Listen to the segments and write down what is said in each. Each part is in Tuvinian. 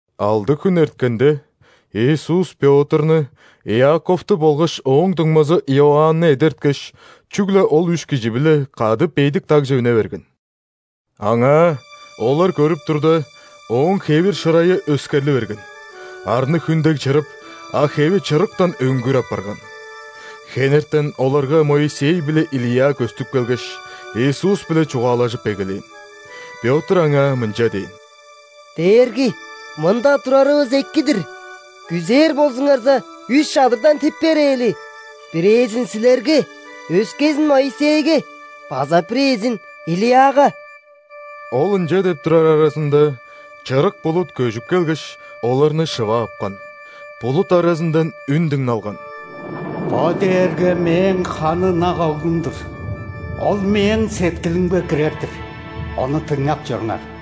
Алды хүн эрткенде, Иисус Пётрну, Иаковту болгаш ооң дуңмазы Иоанны эдерткеш, чүгле ол үш кижи-биле кады бедик дагже үне берген. Аңаа, олар көрүп турда, Ооң хевир-шырайы өскерли берген: арны хүн дег чырып, а хеви чырыктан өңгүр апарган. Хенертен оларга Моисей биле Илия көстүп келгеш, Иисус-биле чугаалажып эгелээн. Пётр Аңаа мынча дээн: «Дээрги, мында турарывыс эки-дир! Күзээр болзуңарза, үш чадырдан тип берээли: бирээзин – Силерге, өскезин – Моисейге, база бирээзин – Илияга». Ол ынча деп турар аразында, чырык булут көжүп келгеш, оларны шыва апкан. Булут аразындан үн дыңналган: «Бо дээрге Мээң ханы ынак Оглум-дур! Ол Мээң сеткилимге кирер-дир! Ону дыңнап чоруңар!»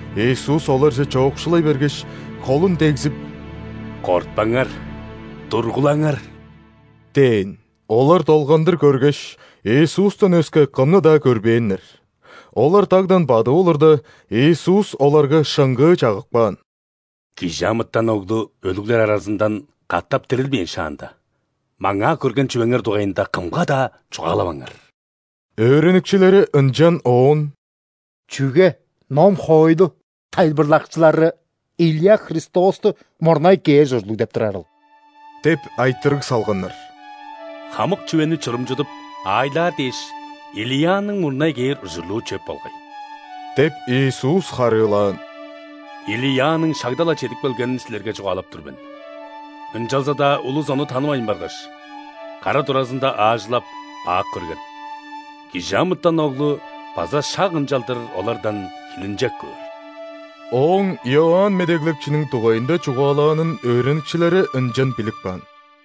Иисус оларже чоокшулай бергеш, холун дегзип: «Кортпаңар, тургулаңар!» – дээн. Олар долгандыр көргеш, Иисустан өске кымны-даа көрбээннер. Олар дагдан бадып олурда, Иисус оларга шыңгыы чагып каан: «·Кижи амытан Оглу өлүглер аразындан катап дирилбээн шаанда, маңаа көрген чүвеңер дугайында кымга-даа чугаалаваңар!» Өөреникчилери ынчан Оон: «Чүге ном-хоойлу тайылбырлакчылары Илия Христосту мурнай кээр ужурлуг деп турарыл?» – деп айтырыг салганнар. «Хамык чүвени чурумчудуп, аайлаар дээш, Илияның мурнай кээр ужурлуу чөп болгай – деп, Иисус харыылаан. – Илияның шагда-ла чедип келгенин силерге чугаалап тур мен. Ынчалза-даа улус ону танывайн баргаш, кара туразында аажылап, бак көрген. Кижи амытан Оглу база шак ынчалдыр олардан хилинчек көөр». Ооң Иоанн Медеглекчиниң дугайында чугаалаанын өөреникчилери ынчан билип каан.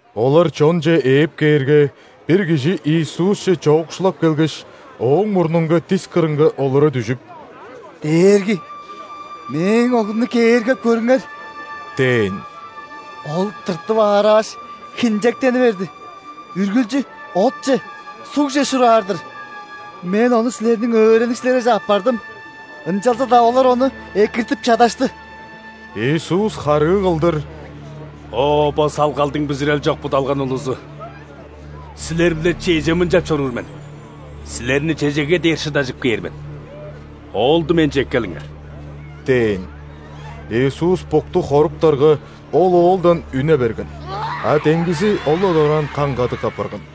Олар чонче ээп кээрге, бир кижи Иисусче чоокшулап келгеш, Ооң мурнунга дис кырынга олура дүжүп: «Дээрги, мээң оглумну кээргеп көрүңер! – дээн. – Ол тыртып аарааш, хинчектени берди: үргүлчү отче, сугже шураар-дыр. Мен ону Силерниң өөреникчилериңерже аппардым, ынчалза-даа олар ону экиртип чадашты». Иисус харыы кылдыр: «О, бо салгалдың бүзүрел чок, будалган улузу! Силер-биле чеже мынчап чоруур мен?! Силерни чежеге дээр шыдажып кээр мен?! Оолду Менче эккелиңер!» – дээн. Иисус букту хоруптарга, ол оолдан үне берген, а демгизи ол-ла дораан каң-кадык апарган.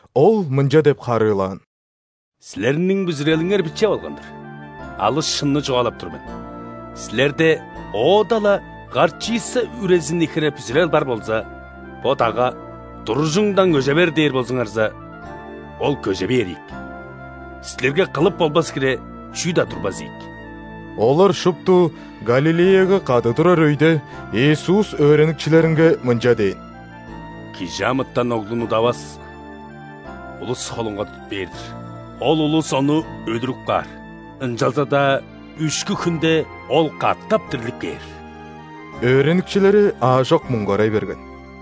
Ол мынча деп харыылаан: «Силерниң бүзүрелиңер биче болган-дыр. Алыс шынны чугаалап тур мен: силерде оода-ла горчица үрезини хире бүзүрел бар болза, бо дагга: „Туружуңдан көже бер“ – дээр болзуңарза, ол көже бээр ийик, силерге кылып болбас хире чүү-даа турбас ийик». Олар шупту Галилеяга кады турар өйде, Иисус өөреникчилеринге мынча дээн: «·Кижи амытан Оглун удавас улус холунга тудуп бээр-дир. Ол улус Ону өлүрүп каар, ынчалза-даа үшкү хүнде Ол катап дирлип кээр». Өөреникчилери аажок муңгарай берген.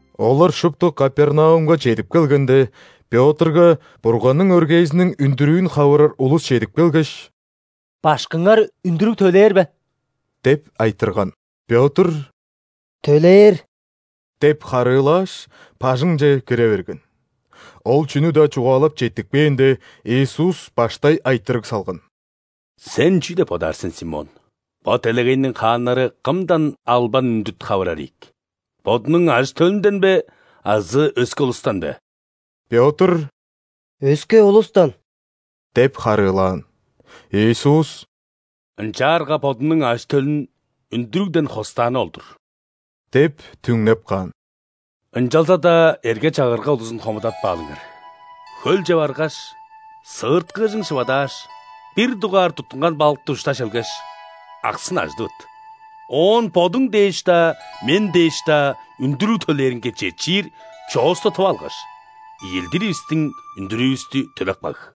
Олар шупту Капернаумга чедип келгенде, Пётрга Бурганның өргээзиниң үндүрүүн хавырар улус чедип келгеш: «Башкыңар үндүрүг төлээр бе?» – деп айтырган. Пётр: «Төлээр!» – деп харыылааш, бажыңче кире берген. Ол чүнү-даа чугаалап четтикпээнде, Иисус баштай айтырыг салган: «Сен чүү деп бодаар сен, Симон? Бо делегейниң хааннары кымдан албан-үндүт хавырар ийик? Бодунуң ажы-төлүнден бе азы өске улустан бе?» Пётр: «Өске улустан» – деп харыылаан. Иисус: «Ынчаарга бодунуң ажы-төлүн үндүрүгден хостааны ол-дур – деп түңнеп каан. – Ынчалза-даа эрге-чагырга улузун хомудатпаалыңар. Хөлче баргаш, сыырткыыжың шывадааш, бир дугаар туттунган балыкты ушта шелгеш, аксын ажыдывыт. Оон бодуң дээш-даа, Мен дээш-даа үндүрүг төлээринге четчир чоосту тып алгаш, ийилдиривистиң үндүрүүвүстү төлеп каг».